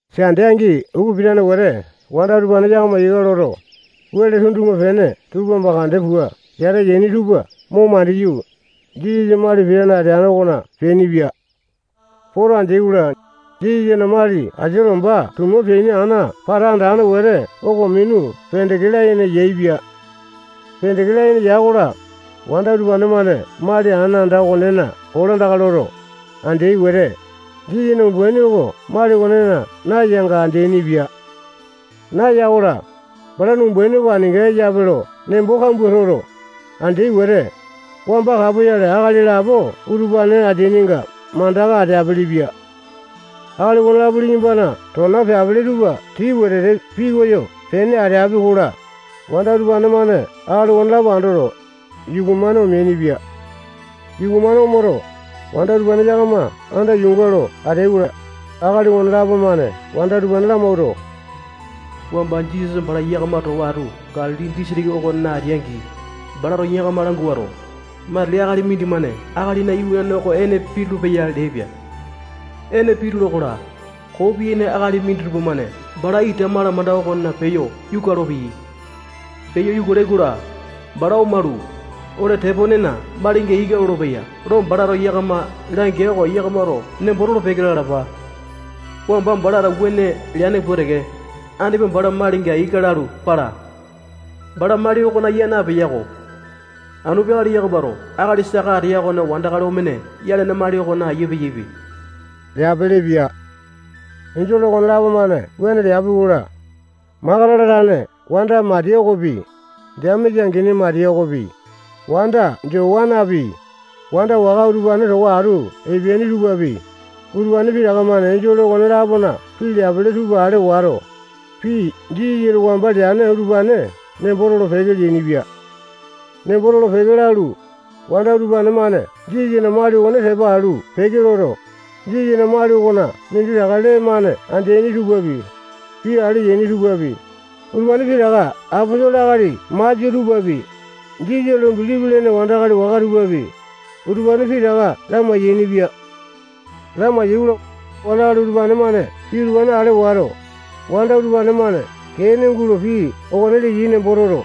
Sande angi upa pitane wete wanda utupane yakama ika loto, wele tundupa-pene tupa mandeke pua yata yaini tupa mo mandiyu, Jisasa mali pitane ateane okona peainipia. Poto andeai-kola, Jisasana mali asia lomba tuma peane ana pata andane wete oko minu pendeke layene yaepia. Pendeke layene ya-kola, wanda utupane-mane mali ana anda okonena kolandaka loto, andeai wete, Jisasana umbaini oko mali okonena nayanga andeaini-pia. Naya-kola, balana umbaini oko aninga eyape lo nembo kambua toto, andeai wete, wamba kapoyale akali lapo utupane ateainga mandaka ateapele-pia. Akali okonelapo liyambana tona peapele tupa tii wetete piyoko pene ateapi-kola, wanda utupane-mane akali okonelapo andoto, yuku-mane omeainipia. Yuku-mane omoto, wanda utupane yakama anda yuunga lo ateai-kola, akali okonelapo-mane wanda utupane lamawuato, wamba Jisasa bala yakama towa atu Galili disitiki okona ateai-angi, balato yakama languato, matili akali mindimane Akalina Iwanane oko ene pitulu-peya leaipia. Ene pitula-kola, koo piyaini akali minditupa-mane bala ita malamanda okona peyo yuka olopeyai. Peyo yuka olai-kola, bala omalu, ole teponena malinga ika lolopeya lo balato yakama langea oko yakamato nembo tolo-peke lalapa. Wamba balato wuane leane pua teke, andipa bala malinga ika lalu pala. Bala mali okona ya napeya-ko. Anu peakale yakamato akali saka ateya okone wandakali omene yalane mali okona ayia peyaipe leapelepia. Enjole okonelapo-mane wuane leapi-kola, Makatala tane wanda Matiya okopi, Jemesa angini Matiya okopi, wanda Jowanapi, wanda waka utupane towa atu epeaini tupapi, utupane pitaka-mane enjole okone-lapona pii leapele tupa ale wato, pii Jisasato wamba leane utupane nembo tolo-peke leainipia. Nembo tolo-peke lalu, wanda utupane-mane Jisasana mali okone tepa alu peke loto, Jisasana mali okona minditaka lee-mane andeaini tupapi, pii ale yaini tupapi, utupane pitaka aposolo akali masia tupapi, Jisasa lo bilipi lene wandakali waka tupapi, utupane pitaka lamai-yainipia. Lamai-yaikola, wandakali utupane-mane pii utupane ale wato, wanda utupane-mane kee ene gulo pii okone leyai nembo toto,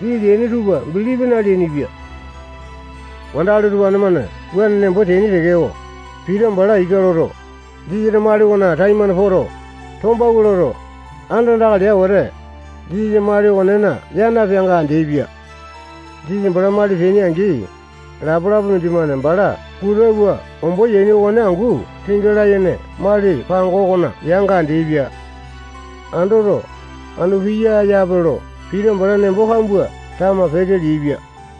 pii leaini tupa bilipi naleainipia. Wandakali utupane-mane wuane nembo teaini tekeko, Pita bala ika loto, Jisasana mali okona taimane poto, tombawua loto, andandaka lea wete, Jisasa mali okonena ya napeanga andeapia. Jisasa bala mali peaini-angi, lapa-lapa mindimane bala puta pua ombo yaini okone angu tinga layene mali pango okona yanga andeaipia. Andoto, anu piya yape lo Pita bala nembo kambua tama peke leaipia.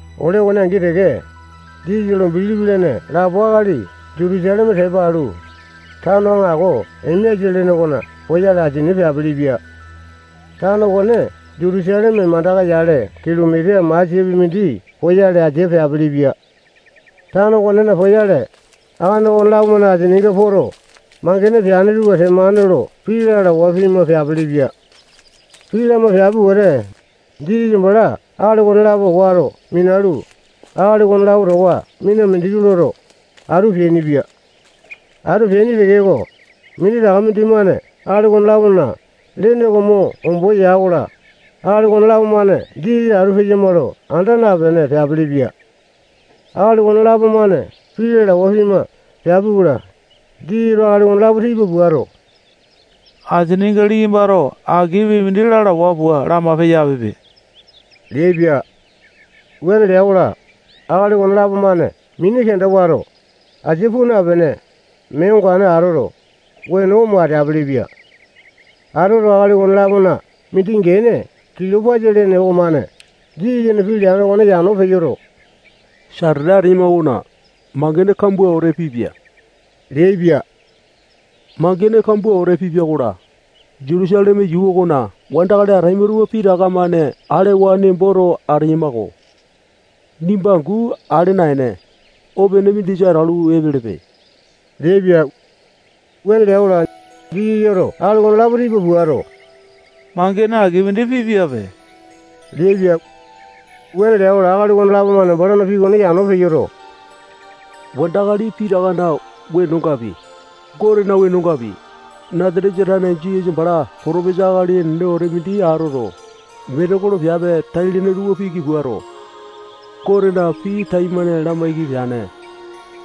Ole okone angi teke, Jisasa lo bilipi lene lapo akali Jutusaleme tepa alu, tano aŋako Emeasa lene okona poyale asia peapelepia. Tano okone Jutusaleme mandaka-yale kilomita masiapi mindi poyale asia peapelepia. Tano okonena poyale, akali okonelapo-mane asininga poto, mangene peane tupa temane lo pii lalawa pima peapelepia. Pii lama peapi wete, Jisasa bala akali okonelapo wato minalu, akali okonelapo towa mina mindiki loto, atu peainipia. Atu peaini tekeko, minditaka mindimane akali okone-lapona lene oko mo ombo ya-kola, akali okonelapo-mane Jisasa atu peyama lo anda napene peapelepia. Akali okonelapo-mane pii lalawa pima peapi-kola, Jisasato okonelapo tipa puato, asininga liyambato aki pii mindi lalawa pua lama peyapipe leaipia. Wuane lea-kola, akali okonelapo-mane mini kenda wato, asia puu napene, mee ongane atoto, weno omo ateapele-pia. Atoto, akali okone-lapona mindi gene Kilopasa lene okomane Jisasana pii leane okone yano peyoto, satete ateyama okona mangene kambua wete pipia leaipia. Mangene kambua wete pipia-kola, Jutusaleme yuu okona wandakali ataima tupa pitaka-mane alewa nemboto ateyama-ko. Nimba angu ale naene, opene mindisa atalu epelepe leaipia. Wuane lea-kola, Jisasato akali okonelapo tipa puato, mangene aki mindi pipiape leaipia. Wuane lea-kola, akali okonelapo-mane balana pii okone yano peyoto, wandakali pitakana wenongapi, Gotena wenongapi, Nasatesa tane Jisasa bala potopesa akali enene wete mindi atoto, metekolo piape tai-lene tupa piki puato, Gotena pii taimane lamaiki peane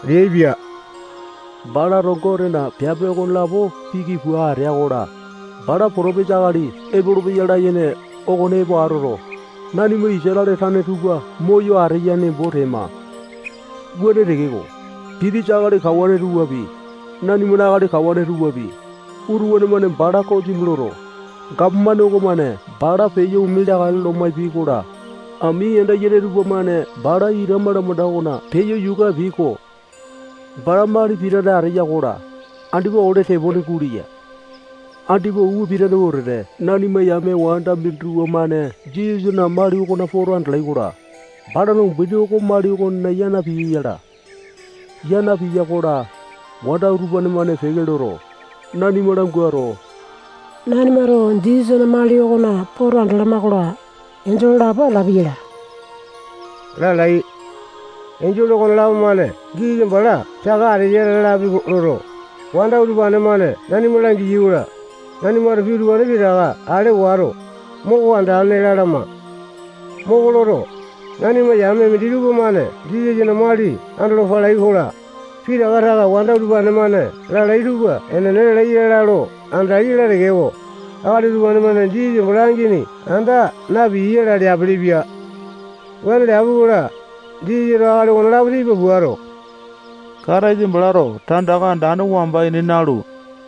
leaipia. Balato Gotena piape okonelapo piki pua atea-kola, bala potopesa akali epolopeya layene okone epo atoto, nanima Isatale tane tupa moyo ateya nembo tema. Wuane tekeko, pitisa akali kawane tupapi, nanimana akali kawane tupapi, utupane-mane bala kosimi loto, gapomane okomane bala peyo ome leakale lo maipiai-kola, ami yanda yene tupamane bala ita malamanda okona peyo yuka apiai-ko. Bala mali pitane ateya-kola, andipa ole tepone guleya. Andipa upa pitane wetete nanima yame wanda minditupa-mane Jisasana mali okona poto andalai-kola, balana umbaini oko mali okonena ya napiya yala. Ya napiya-kola, wanda utupane-mane peke loto, nanima languato, nanimato Jisasana mali okona poto andalama-kola, enjole lapo atalapi yala lalai. Enjole okonelapo-mane Jisasa bala saka ateya lalapi loto, wanda utupane-mane nanima langiyai-kola, nanimato pii utupane pitaka ale wato, moko andane lalama. Moko loto, nanima yame minditupa-mane Jisasana mali andolo palai-kola, pitaka taka wanda utupane-mane lalai tupa enene lalai ya lo andalai yala tekeko, akali utupane-mane Jisasa bala angini anda napiyai yala leapelepia. Wuane leapi-kola, Jisasato akali okonelapo tipa puato, Kataisa balato tandaka andane wamba ini nalu,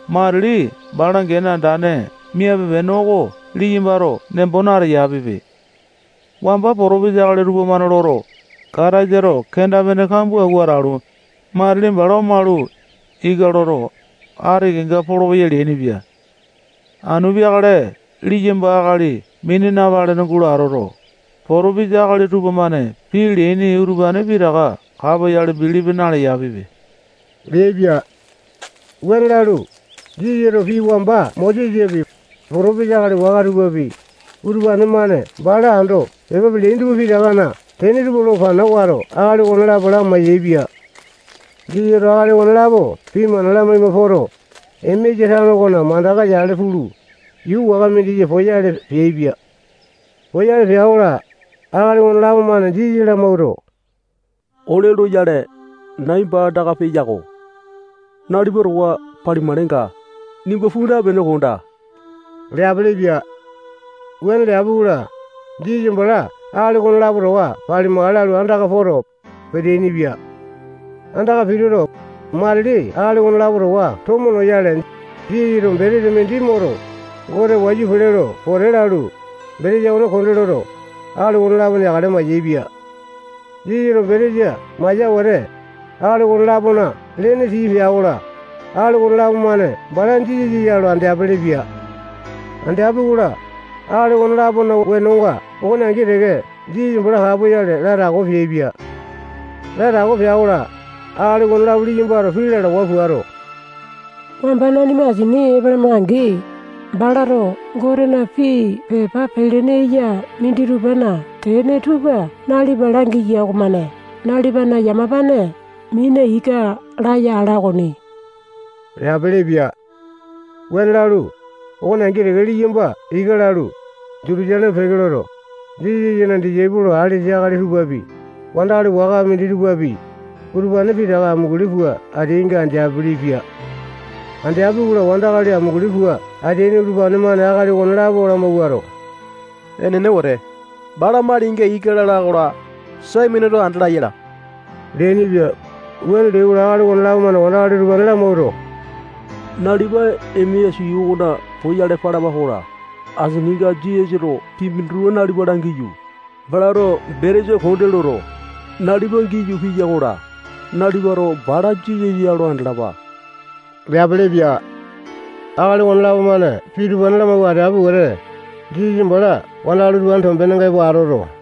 matili bala gene andane miape-pene oko liyambato nembo nateyapipe. Wamba potopesa akali tupamane loto, Kataisato kenda-pene kambua awua atalu, matili bala omalu, ika loto, ati kenga polopeya leainipia. Anu peakale liyamba akali mini napalene gulo atoto, potopesa akali tupamane pii leaini utupane pitaka kapoyale bilipi naleyapipe leaipia. Wuane lalu, Jisasato pii wamba Mosesapi, potopesa akali waka tupapi, utupane-mane bala ando pepa peleaini tupa pitakana tene tupa lo pana wato, akali okonelapo lamai-yaepia. Jisasato akali okonelapo pii mana lamaima poto, Emeasa tano okona mandaka yale pulu, yuu waka mindisa poyale peaipia. Poyale pea-kola, akali okonelapo-mane Jisasa lamawuato, ole loyale, nai baa andaka peya-ko. Nalipa towa palimakalenga, nimba puu napene, kondaa leapelepia. Wuane leapi-kola, Jisasa bala akali okonelapo towa palimakale lalu, andaka poto, peteaini-pia. Andaka pituto, matili akali okonelapo towa tomo noyale, Jisasato betesa mindi moto, Gote wayu pele lo pote lalu, betesa okone konde loto, akali okonelapo neakale maiyapia. Jisasato betesa maya wete, akali okone-lapona lene tii pea-kola, akali okonelapo-mane bala Jisasa ya lo andeapele-pia. Andeapi-kola, akali okone-lapona wenonga okone angi teke Jisasa bala kapoyale latako peaipia. Latako pea-kola, akali okonelapo liyambato pii lalawa puato, wamba nanima asini epalama-angi, balato Gotena pii pepa pelene eya minditupana tene tupa nalipa langiya okomane nalipana yamapane mina ika laya ala okoni leapelepia. Wuane lalu, okone angi teke liyamba ika lalu, Jutusaleme peke loto, Jisasana disaipolo alesa akali tupapi, wandakali waka minditupapi, utupane pitaka amunguli pua ateainga andeapili-pia. Andeai-kola, wandakali amunguli pua peteaini tupamane akali okonelapo lamawuato, enene wete, bala malinga ika lala-kola, Saimoneto andala yala leainipia. Wuane leai-kola, akali okonelapo-mane wandakali utupane lamawuato, nalipa Emeasa yuu okona poyale palapa-kola, asininga Jisasato pii minditupa nalipa langiyu, balato betesa konde loto, nalipa giyu piya-kola, nalipato bala Jisasa ya lo andalapa leapelepia. Akali okonelapo-mane pii utupane lamawua ateapi wete, Jisasa bala wandakali utupanena tombenenga epo ateaipia.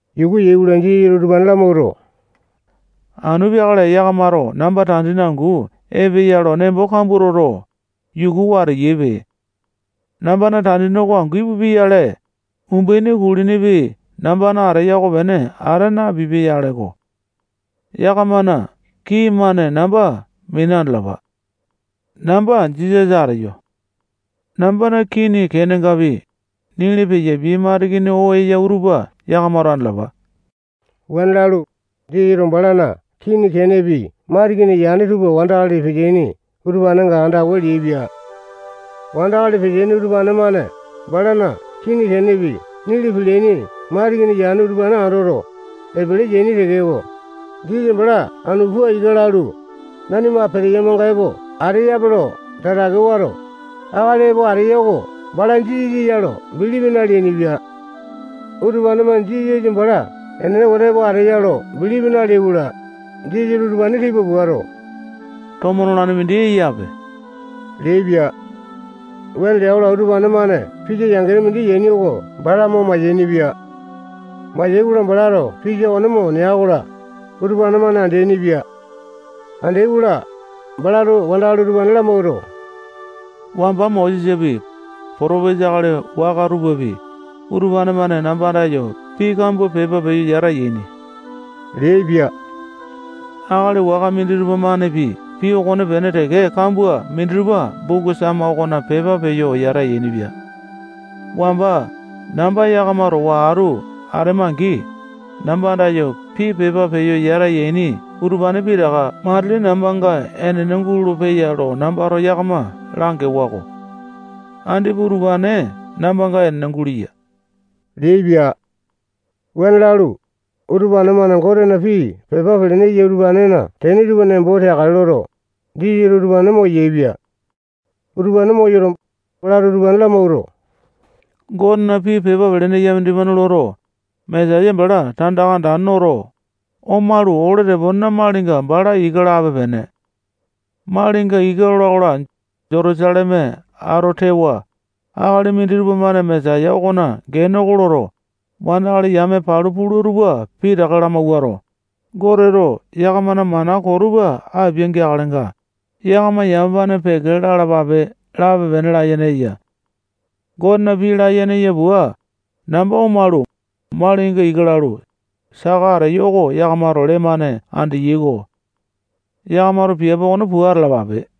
Yuku yai-kola, Jisasato utupane lamawuato, anu peakale yakamato namba tandini angu epeya lo nembo kambua toto, yukuwa ateyaipe. Nambana tandini oko angu ipupia-yale, umbaini kulinipi nambana ateya okopene ata napipia-yaleko. Yakamana kii-mane namba mina andalapa. Namba Jisasa ateyo. Nambana kini kenengapi, nili peyapiai matikini oo eya utupa yakamato andalapa. [Wuane lalu, Jisasato balana kini kenengapi matikini yane tupa wandakali peteaini utupanenga andawa leaipia.] Wandakali peteaini utupane-mane balana kini kenepi nili peleaini matikini yane utupane andoto, epele yaini tekeko, Jisasa bala anu pua ika lalu, nanima peteyamanga epo ateyape lo tatake wato, akali epo ateya oko bala Jisasa ya lo bilipi naleainipia. Utupane-mane Jisasa bala enene wete epo ateya lo bilipi naleai-kola, Jisasato utupane tipa puato, tomo nolane mindi eyape leaipia. Wuane lea-kola, utupane-mane pisa yangene mindi yaini oko bala mo mayainipia. Mayai-kola, balato pisa okone mo nea-kola, utupane-mane andeaini-pia. Andeai-kola, balato wandakali utupane lamawuato, wamba Mosesapi, potopesa akali waka tupapi, utupane-mane namba andayo pii kambua pepa peyo yata yaini leaipia. Akali waka minditupa-manepi pii okonepene teke kambua minditupa buku Sama okona pepa peyo yata yainipia. Wamba namba yakama towa atu atema-angi, namba andayo pii pepa peyo yata yaini utupane pitaka matili nambanga enene gulolo-peya lo nambato yakama langewa-ko. Andipa utupane nambanga enene guleya leaipia. Wuane lalu, utupane-mane Gotena pii pepa pelene eya utupanena tene tupa nembo teakale loto, Jisasato utupane moyaepia. Utupane moyoto, balato utupane lamawuato, Gotena pii pepa pelene eya mindimane loto, Mesaya bala tandaka andane noto, omalu, ole teponena malinga bala ika lape-pene. Malinga ika lola-kola, Jutusaleme ato tewa, akali minditupa-mane Mesaya okona gene oko loto, wandakali yame palu pula tupa pitaka lamawuato, Goteto yakamana mana koo tupa apia-geakalenga, yakama yamapane peke lalapape lape-pene layene eya. Gotena pii layene eya pua, namba omalu, malinga ika lalu, saka ateyo oko yakamato lee-mane andeyai-ko. Yakamato piape okone pua atalapape.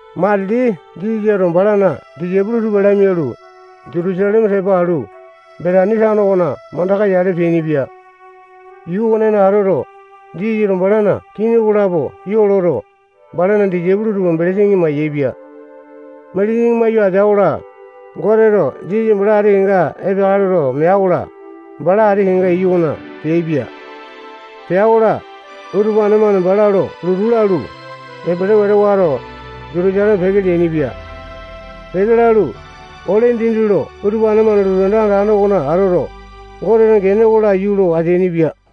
Matili Jisasato balana disaipolo tupa lamialu, Jutusaleme tepa alu, Betani tano okona mandaka yale peainipia. Yuu okonena atoto, Jisasato balana kini okolapo ya loto, balana disaipolo tupa belesini mindi mayaepia. Belesini mawua atea-kola, Goteto Jisasa bala ati kenga epeakale loto mea-kola, bala ati kenga iyu okona peaipia. Pea-kola, utupane-mane bala lo lotu lalu, epele wete wato, Jutusaleme peke leainipia. Peke lalu, ole dindi lo utupane-mane lotu anda andane okona atoto, Gotena gene oko laiyu lo ateainipia.